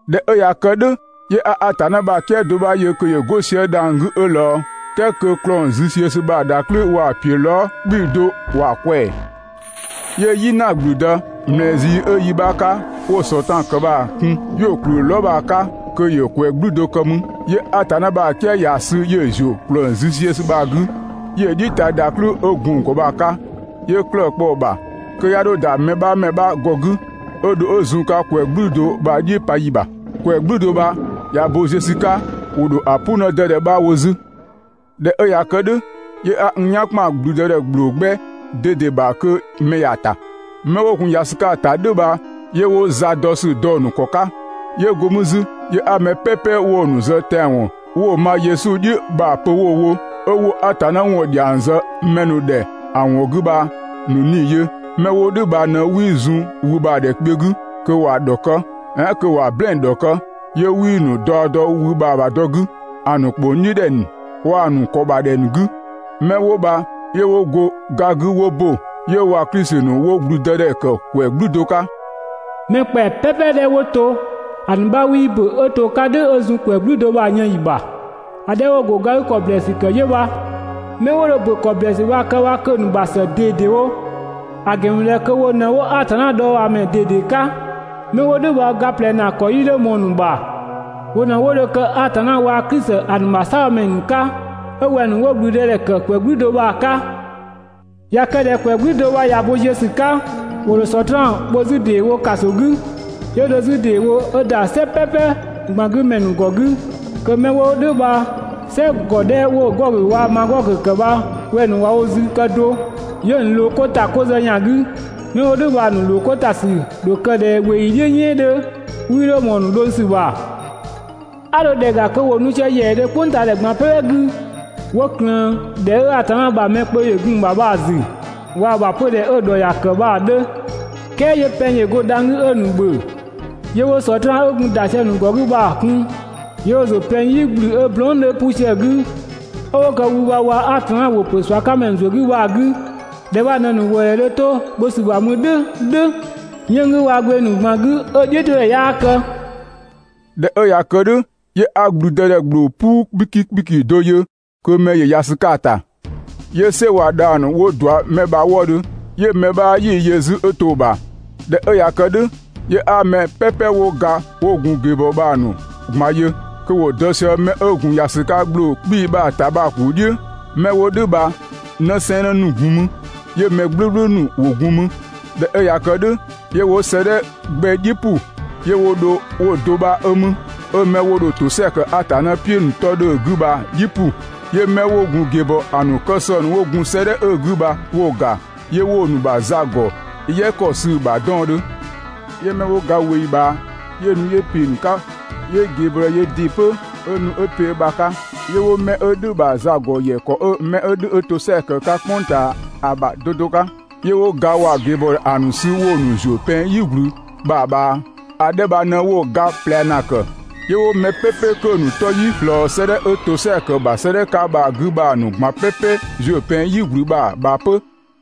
꞊Dhɛ 'ö ꞊ya kë "dhʋ̈, 'yö 'a Atanna ‑bha "kië do 'bha yö kö ‑yö 'go sië dhang‑ 'gü 'ö ꞊lɔɔ. "Kɛɛ kö ‑klɔng züziösü bha‑ ‑dhaklɩ waa‑ ‑piö lɔɔ" 'kpii‑ do ‑wa ꞊kwɛɛ‑. 'Yö "yina ‑gblüdë, ꞊mlɛɛ zii 'ö yi 'bha 'ka 'wo‑ Sɔtraan ‑kë bha‑ kun, 'yö‑ ‑kplü lɔɔ" bha‑ 'ka kö ‑yö ‑kwɛ "gblü do kë mü. 'Yö Atanna ‑bha "kië ‑ya sü 'yö‑ ‑zuö ‑klɔng züziösü bha‑ 'gü, 'yö‑ "dhiʋ̈ ta ‑dhaklɩ 'ö gun‑ ‑gɔ bha‑ 'ka, 'yö 'klëë‑ kpɔ‑ ‑bha, kë "dhʋ̈ kö 'ya 'dho ‑da mɛ 'bha ‑mɛ 'bha ‑gɔ 'gü 'ö dho 'ö zun‑ 'ka ‑kwɛ "gblü do bha‑ "dhiʋ̈ pa ‑yi ‑bha. ‑Kwɛ "gblü do bha ꞊ya bo ziö ‑sü 'ka, ‑wo ‑dho ‑a "pʋ 'në 'dɛdɛ 'bha wo 'zü. ꞊Dhɛ 'ö ꞊ya kë "dhʋ̈, 'yö 'a n "yan ‑kpan ‑blüdëdhɛ ‑gbloo 'gbɛ ꞊dede ‑bha kö mɛ ‑ya ‑ta. 'Mɛ 'wo gun ‑ya ‑sü 'ka‑ ‑ta "dhʋ̈ bha 'yö 'wo za dɔ ‑sü dɔ‑ ‑nu ‑kɔ 'ka. 'Yö go mü 'zü 'yö 'a mɛ "pɛpɛ 'wo‑ ‑nu zë tɛanwɔn 'wo‑ ma Yesu "dhi ‑a pö 'wo‑ wo, 'ö 'wo Atanna ‑wɔn ‑dhiang zë mɛ ‑nu ‑dhɛ ‑a ‑wɔn 'gü bha‑ ‑nu 'nii‑ ‑nu yö. 'Mɛ 'wo "dhʋ̈ bha ꞊në 'wii zun wü bha‑ ‑dhɛ kpiö 'gü kö ‑wa ‑dhɔkë, "ɛɛn kö ‑wa "blɛɛn‑ ‑dhɔkë. 'Yö 'wii‑ ‑nu daɔ dɔ wü bha‑ ‑bha dɔ 'gü ‑a ‑nu ‑kpong "dhiʋ̈ ‑dhɛ ‑nu waa‑ ‑nu ‑kɔ ‑bha ‑dhɛ ‑nu 'gü. 'Mɛ 'wo bha 'yö 'wo go ga 'gü 'wo ‑bö, 'yö waa‑ Klisi ‑nu 'wo ‑gblüdëdhɛ ‑kë ‑kwɛ "gblü do 'ka. ‑Mɛ ‑kpɛa "pɛpɛ 'dhɛ 'wo to, ‑a ‑nu 'bha 'wii ‑bö 'ö to‑ 'ka "dhʋ̈ 'ö zun ‑kwɛ "gblü do bha‑ yën ‑yi ‑bha. ‑A 'dhɛ 'wo‑ ‑go ga 'gü ‑kɔ ‑blɛɛsü ‑kë bha 'yö bha. 'Mɛ 'wo dho ‑bö ‑kɔ ‑blɛɛsü bha‑ kë bha kö‑ ‑nu ‑bha ‑së ꞊dedewo, ‑a ‑gɛn ‑mü ꞊dhɛ kö wo ꞊në 'wo Atanna dhɔɔbhaamɛ ꞊dede 'ka. 'Mɛ 'wo "dhʋ̈ bha ga ꞊plɛ ‑naa ‑kɔ 'yii 'dho ꞊mɔɔ‑ ‑nu ‑bha. Wo ꞊në 'wo dho kë Atanna waa‑ Klisi ‑a ‑nu ‑bha "saabhomɛ ‑nu 'ka 'ö wɛng‑ ‑nu 'wo ‑gblüdëdhɛ ‑kë ‑kwɛ "gblü do bha‑ 'ka. ꞊Ya kë ꞊dhɛ ‑kwɛ "gblü do bha ꞊ya bo ziö ‑sü 'ka, ‑wo ‑dho Sɔtraan bho 'zü ‑deewo ‑kaso 'gü. 'Yö dho 'zü ‑deewo 'ö ‑da "sɛ "pɛpɛ ꞊gban 'gü ‑mɛ ‑nu ‑gɔ 'gü, kö mɛ 'wo "dhʋ̈ bha "sɛ 'dhɛ 'wo‑ Gɔgö waa‑ Magɔgö ‑kë bha wɛng‑ ‑nu ꞊wa wo zü kë do. 'Yö‑ ‑nu ꞊loo 'ko ‑ta 'ko zë ‑yan 'gü. 'Mɛ 'wo "dhʋ̈ bha‑ ‑nu ‑loo 'ko ‑ta ‑sü ‑dho kë ꞊dhɛ ꞊weeyi "dhiʋ̈ "yɛɛn 'dhö, 'wii 'dho ꞊mɔɔ‑ ‑nu dhʋng ‑sü ‑bha. 'A dho ‑dhɛ ‑ga kö ‑wo nu sië ‑yɛɛdhö "kpʋngtaadhɛ ꞊gban "pɛpɛ 'gü, 'wo ꞊klëën ‑dhɛ 'ö Atanna ‑bha mɛ ‑nu kpö ‑yö gun‑ ‑bha bha‑ ‑zü waa‑ ‑bha 'pödhɛ 'ö‑ ‑dhɔ ‑ya ‑kë bha‑ 'dhö. "Kɛɛ 'yö pɛng ‑yö go dhang‑ 'gü 'ö‑ ‑nu ‑bhö. 'Yö 'wo Sɔtraan 'ö gun ‑da sië‑ ‑nu ‑gɔ 'gü bha‑ kun, 'yö 'wo‑ ‑zuö pɛng "yi ꞊gblü 'ö blɔɔn" 'dhö 'pu sië‑ 'gü 'ö 'wo kë wü bha waa‑ Atanna ‑wʋ ‑pö ꞊sua 'ka ‑mɛ ‑zuö 'gü bha‑ 'gü. ‑Dhɛ bha ꞊në‑ ‑nu ‑wëëdhɛ dho 'to bho ‑sü ‑bha mü "dhʋ̈ "dhʋ̈ 'yënng‑ 'gü waa‑ gbeng ‑nu ꞊gban 'gü 'ö‑ "dhiʋ̈todhɛ 'yaa kë. ꞊Dhɛ 'ö ꞊ya kë "dhʋ̈, 'yö 'a ‑blüdëdhɛ ‑gbloo "puu 'kpiki ‑kpiki do yö kö mɛ ‑yö ‑ya ‑sü 'ka‑ ‑ta. 'Yö "sɛ waa‑ dhang‑ ‑nu 'wo ꞊dua 'mɛ bha‑ wëëdhö 'yö mɛ 'bha 'yii‑ yö 'zü 'ö to‑ ‑bha. ꞊Dhɛ 'ö ꞊ya kë "dhʋ̈, 'yö 'a mɛ "pɛpɛ 'wo ga 'ö 'wo gun ꞊geebɔɔ bha‑ ‑nu ꞊gban yö kö ‑wo dɔ sië mɛ 'ö gun ‑ya ‑sü 'ka ‑gbloo 'kpii‑ bha‑ ‑ta bha‑ ‑kuu "dhiʋ̈. 'Mɛ 'wo "dhʋ̈ bha 'në sɛɛnnë ‑gun mü, 'yö mɛ "gblʋ̈gblʋ̈ ‑nu ‑wo gun mü. ꞊Dhɛ 'ö ꞊ya kë "dhʋ̈, 'yö 'wo 'sëëdhɛ 'gbɛ "dhiʋ̈ ‑pʋ. 'Yö 'wo dho 'wo‑ do 'bha 'ö mü, 'ö mɛ 'wo dho ‑tosɛa kë Atanna "piʋ̈‑ ‑nu 'tɔ 'dhö‑ 'gü bha‑ "dhiʋ̈ ‑pʋ. 'Yö 'mɛ 'wo gun ꞊geebɔɔ, ‑a ‑nu kë sɔng ‑nu 'wo gun 'sëëdhɛ 'ö‑ 'gü bha 'wo‑ ‑ga, 'yö 'wo‑ ‑nu ‑bha za ‑gɔ "yɛ ‑kɔ sü‑ ‑bha 'dɔɔndhö. 'Yö 'mɛ 'wo ga ꞊weeyi ꞊bhaa, 'yö nu 'yö ‑pe ‑nu 'ka, 'yö ꞊geebɔɔdhɛ yöö ‑dɩ 'pö 'ö nu 'ö ‑pe ö ‑bha 'ka. 'Yö 'wo 'mɛ 'ö "dhʋ̈‑ ‑bha za ‑gɔ ‑yɛ ‑kɔ 'ö 'mɛ 'ö "dhʋ̈ 'ö ‑tosɛa ‑kë 'ka "kpʋng ꞊taa ‑a ‑bha 'do 'do 'ka. 'Yö 'wo ga waa‑ ꞊geebɔɔdhɛ ‑a ‑nu sü 'wo‑ ‑nu ‑zuö pɛng "yigblü bha‑ ꞊bhaa. (‑A 'dhɛ bha ꞊në 'wo‑ ga ꞊plɛ ‑naa ‑kë.) 'Yö 'wo mɛ "pɛpɛ 'dhɛ 'kö‑ ‑nu 'tɔ 'yii ꞊slɔɔ 'sëëdhɛ 'ö ‑tosɛa ‑kë ‑bha 'sëëdhɛ 'ka bha‑ 'gü bha‑ ‑nu ꞊gban "pɛpɛ ‑zuö pɛng "yigblü bha‑ ꞊bhaa 'pö.